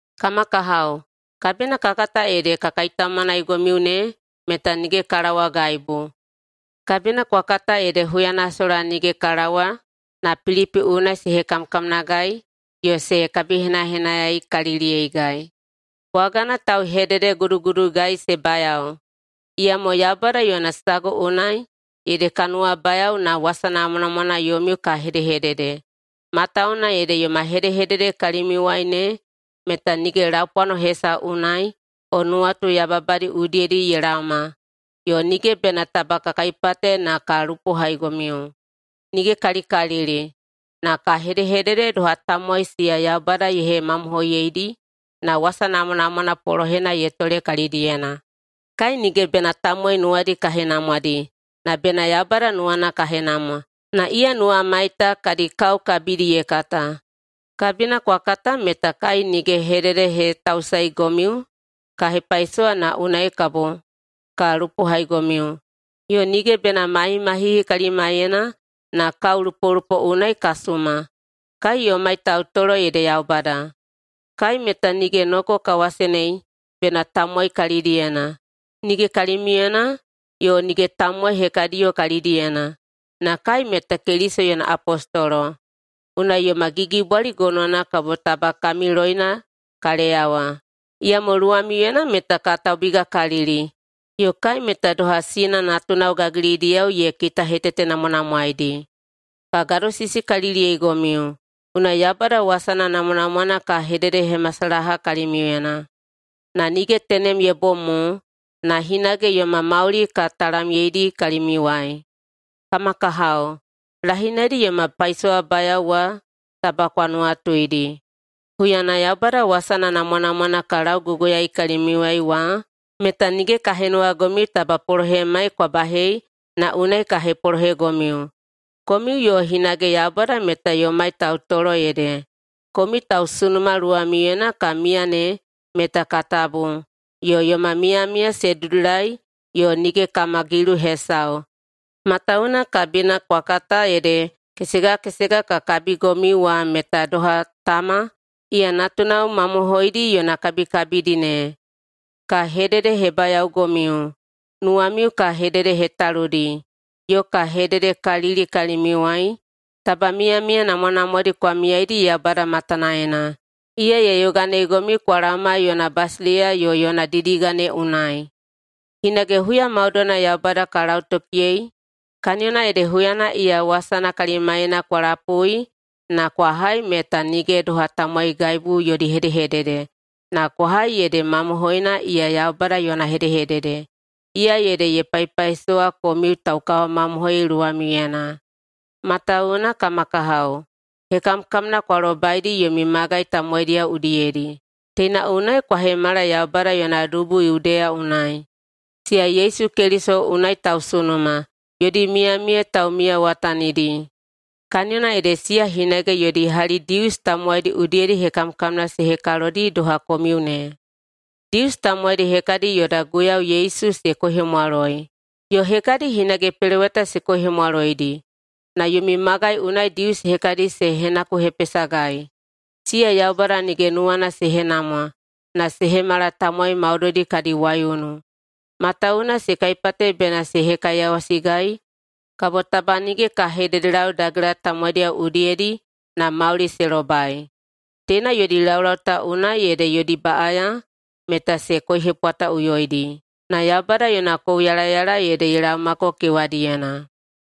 Kama kahao, kabina kwa kata ede ka kaitaumanaigomiu ne meta nige ka laowagaibu. Kabina kwa kata ede huyana sola nige ka laowa na Pilipi unai se hekamkamnagai yo se kabihenahenayaikaliliyeigai. Bwagana tauhededeguduguduigai se bayao, iyamo Yaubada yona sagu unai ede ka nuwabayao na wasa namwanamwana yomiu ka hedehedede. Matawuwuna ede yoma hedehedede kalimiuwai ne meta nige laupwano hesau unai o nuwatu yababadi udiyedi ye laoma, yo nige bena taba ka kaipate na ka lupohaigomiu. Nige kalikalili! Na ka hedehedede doha tamowai siya Yaubada ye hemamohoiyeidi na wasa namwanamwana polohena ye tole kalidiyena. Kai nige bena tamowai nuwadi ka henamwadi, na bena Yaubada nuwana ka henamwa, na iya nuwamai ta kadi kao kabidi ye kata. Kabina kwa kata meta kai nige hededehetausaeigomiu ka hepaisowa na unai kabo ka lupohaigomiu, yo nige bena mahimahihi kalimaiyena na kaolupolupo unai ka suma. Kai yomai tautolo ede Yaubada. Kai meta nige noko ka wasenei bena tamowai kalidiyena, nige kalimiuyena yo nige tamowai hekadiyo kalidiyena. Na kai meta Keliso yona apostolo, unai yoma gigibwali gonowana kabo taba kami loina ka leyawa. Iyamo luwamiuyena meta ka taubigakalili. Yo kai meta doha sina natunao gagilidiyao ye kitahetetenamwanamwaedi. Ka gadosisikaliliyeigomiu, unai Yaubada wasana namwanamwana ka hededehemasalaha kalimiuyena. Na nige tenem ye bom mo na hinage yoma mauli ka talamyeidi kalimiuwai. Kama kahao, lahinaidi yoma paisowabayao wa taba kwa nuwatuidi. Huyana Yaubada wasana namwanamwana ka lauguguyaei kalimiuwai wa meta nige ka henuwagomiu taba polohemai kwa bahei na unai ka hepolohegomiu. Komiu yo hinage Yaubada meta yomai tautolo ede komiu tausunuma luwamiuyena ka miya ne meta ka tabu yo yoma miyamiya se dudulai yo nige kama gilu hesau. Matawuwuna kabina kwa kata ede kesega kesega ka kabigomiu wa meta doha tama iya natunao mamohoidi yona kabikabidi ne. Ka hededehebayaogomiu, nuwamiu ka hededehetaludi yo ka hededekalili kalimiuwai taba miyamiya namwanamwadi kwa miyaidi Yaubada matanaena. Iya ye yoganeigomiu kwa laoma yona basileiya yo yona didiga ne unai. Hinage huya maudoina Yaubada ka lautokiyei kaniyona ede huyana iya wasana kalimaiyena kwa lapui na kwa hai meta nige doha tamowaigaibu yodi hedehedede, na kwa hai ede mamohoina iya Yaubada yona hedehedede, iya ede ye paipaisowa komiu taukawamamohoi luwamiuyena. Matawuwuna, kama kahao, hekamkamna kwa lobaidi yomi magai tamowaidiyao udiyedi. Teina unai kwa hemala Yaubada yona dubu Yudeya unai, siya Yesu Keliso unai tausunuma, yodi miyamiya taumiyawatanidi. Kaniyona ede siya hinage yodi hali Dius tamowaidi udiyedi hekamkamna se hekalodi doha komiu ne. Dius tamowaidi hekadi yoda Guiyau Yesu se koihemwaloi, yo hekadi hinage peloweta se koihemwaloidi. Na yomi magai unai Dius hekadi se henakuhepesagai. Siya Yaubada nige nuwana se henamwa na se hemala tamowai maudoidi kadi waiunu, matawuwuna se kaipate bena se hekaiyawasigai kabo taba nige ka hededelau dagela tamowaidiyao udiyedi na mauli se lobai. Teina yodi laulau ta unai ede yodi baꞌaya meta se koihepwataꞌuyoidi. Na Yaubada yona kouyalayala ede ye laomako kewadiyena.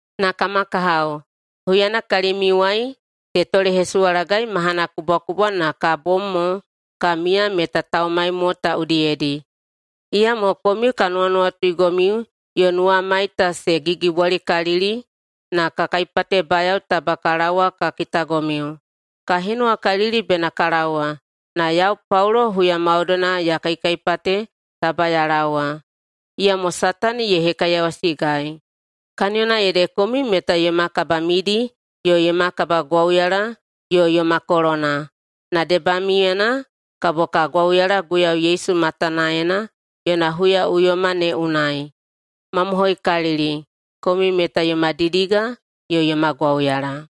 Na kama kahao, huyana kalimiuwai se tolehesuwalagai mahana kubwakubwa na ka bom mo ka miya meta taumai mo ta udiyedi, iyamo komiu ka nuwanuwatuigomiu yo nuwamai ta se gigibwalikalili na ka kaipatebayao taba ka laowa ka kitagomiu. Ka henuwakalili bena ka laowa, na yau Paulo huya maudoina ya kaikaipate taba ya laowa, iyamo Satani ye hekaiyawasigai. Kaniyona ede komiu meta yoma kabamidi yo yoma kabagwauyala yo yoma kolona, na debamiuyena kabo ka gwauyala Guiyau Yesu matanaena yona huyaꞌuyoma ne unai. Mamohoikalili, komiu meta yoma didiga yo yoma gwauyala.